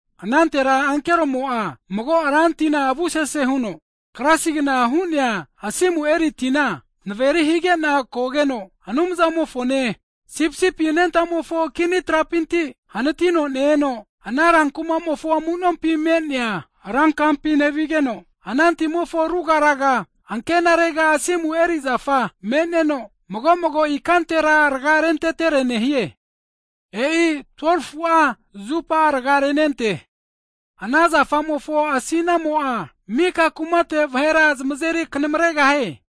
Anantera ankeromo'a mago ra tina avu sese huno klasigna hu'nea asimu eri tina naveri higena kogeno, Anumzamofone Sipisipi anentamofo kini trapinti hanatino ne-eno, ana rankumamofo amunompi nevigeno, ana timofo ruga raga ankenarega asimu eri zafa me'neno, mago'mago ikantera rga rentetere nehie. E'i 12fu'a zupa rga renente. Ana zafamofo asinamo'a, mika kumate vahera zmazeri knamaregahie.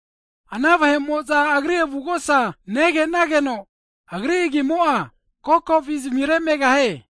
Ana vahe'moza Agri avugosa negenageno, Agri agimo'a kokovi zmire megahie.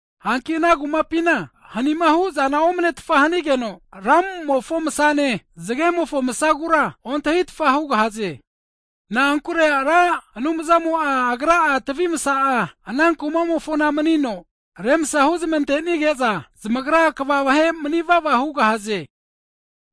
Hanki ana kumapina hanima hu'zana omnetfa hanigeno, lamumofo msane, zgemofo masagura ontahitfa hugahaze. Na'ankure Ra Anumzamo Agra'a tvi msa'a, ana kumamofona manino remsa huzmantenige'za, zamagra kva vahe mni'vava hugahaze.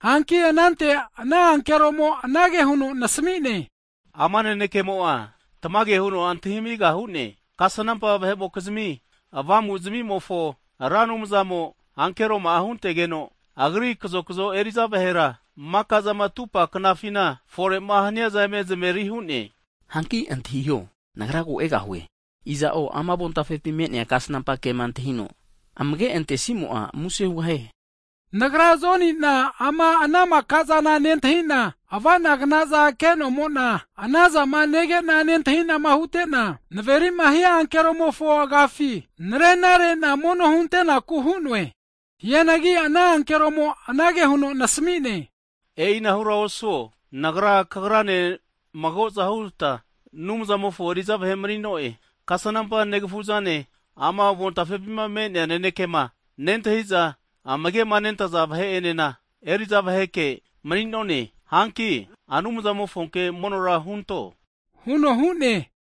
Hanki anante ana ankeromo anage huno nasmi'ne, ama nanekemo'a tamage hu'neankino maka vahe'mo'za zmentinti hugahaze. Kasnampa vahe'mokizmi avamuzmimofona, Ra Anumzamo ankeroma'a huntegeno, Agri kazokazo eri'za vahera maka'zama ame huno efore'ma haniaza eme zmaveri hu'ne. Hanki antahiho, Nagra ko egahue, iza'o ama avontafepi me'nea kasnampa kema antahino amage antesimo'a, muse hugahie. Nagra Joni'na ana maka'zana nentahina avanagnaza kenomona, ana zama negena nentahi'nama hute'na, naverima hia ankeromofo agafi, narena rena mono hunte'naku hu'noe. Hianagi ana ankeromo anage huno nasamine, e'inahura osuo, Nagrane kagranena magozahu huta Anumzamofo eriza vahe manineno'e. Kasnampa negafu'zane, ama avontafepima me'nea nanekema nentahiza amage'ma nentaza vahe'enena eri'za vaheke mni'none. Hanki Anumzamofonke monora hunto huno hu'ne.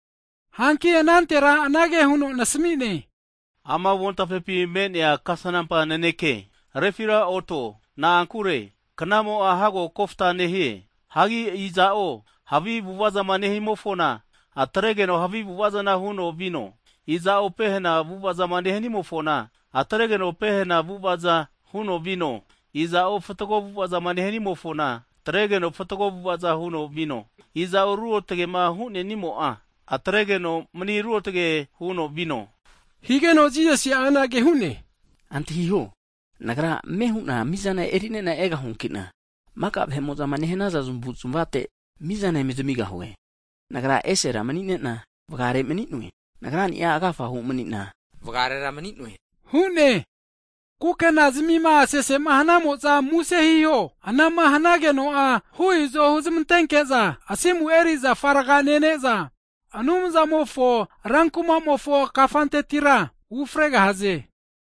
Hanki anantera anage huno nasami'ne, ama avontafepi me'nea kasnampa nanekea refiraoto, na'ankure knamo'a hago kofta nehie. Hagi iza'o havi avu'avazama nehimofona atregeno havi avu'avazana huno vino, iza'o pehena avu'avazama nehanimofona, atregeno pehena avu'avaza huno vino, iza'o fatgo avu'avazama nehanimofona, atregeno fatgo avu'avaza huno vino, iza'o ruotgema hunenimo'a, atregeno mni ruotge huno vino. Higeno Jisasi'a anage hu'ne, Antahiho, Nagra ame hu'na mizana eri'nena egahuankina, maka vahe'mo'zama nehanaza zmavuzmavate mizana eme zamigahue. Nagra'a esera manina (Alfa) vgare mni'noe. (Omega), Nagrani'a agafahu mni'na, vgarera mni'noe hu'ne. Kukenazmima sesema hanamo'za muse hiho, anama hanageno'a hu izo huzmantenke'za, asimu eri zafa rga nene'za Anumzamofo rankumamofo kafantetira ufregahaze.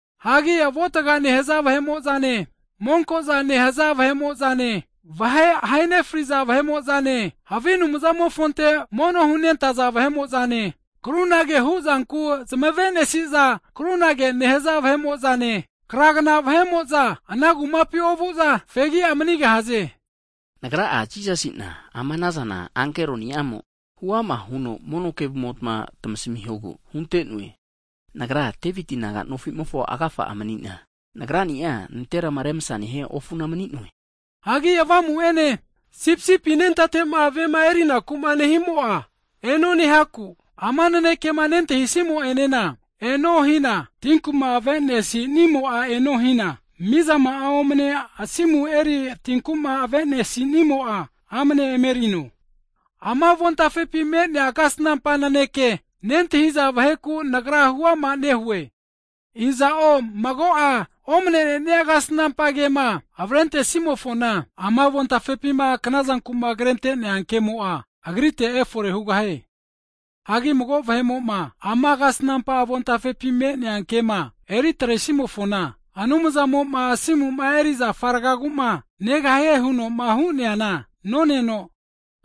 Hagi avuatga ha' nehza vahe'mo'zane monko'za nehaza vahe'mo'zane vahe zmahe nefriza vahe'mo'zane, havi anumzante mono hunentaza vahe'mo'zane, krunage huzanku zmavenesiza, krunage nehaza vahe'mo'zane, kragna vahe'mo'za ana kumapi ovu'za fegi'a manigahaze. Nagra'a Jisasina ama anazana ankeroniamo, huama huno mono kevumota tamasamihogu hunte'noe. Nagra'a Deviti naga nofimofo agafa mni'na, Nagrani'a nanterama remsama nehia ofuna mni'noe. Hagi Avamu'ene, Sipisipi anentate'ma vema erinakuma nehimo'a eno nehaku, ama nanekema nentahisimo'enena, eno hina, tinkuma avenesinimo'a eno hina, mizama'a omne asimu eri tinkuma avenesinimo'a, amane emerino. Ama avontafepi me'nea kasnampa naneke nentahiza vaheku nagra huama nehue, iza'o mago'a omnenenia kasnampa kema avrentesimofona, ama avontafepima knazanku'ma krente'nea ke'mo'a, agrite efore hugahie. Hagi mago vahe'mo'ma ama kema avontafepi me'nea eri atresimofona, Anumzamo'ma asimuma eri zafa rgaguma negahie huno hu'neana oneno,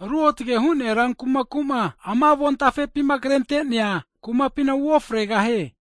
Ruotge hu'nea rankumaku'ma ama avontafepi krente'nea kumapina uofregahie.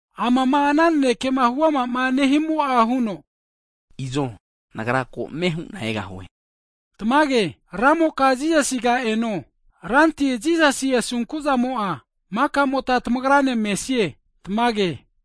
Amama ana naneke huamama nehimo'a huno, Izo Nagra ko ame hu'na egahue. Tamage. Ramoka Jisasiga eno. Ranti Jisasi asunkuzamo'a makamotma tamagrane mesie. Tamage.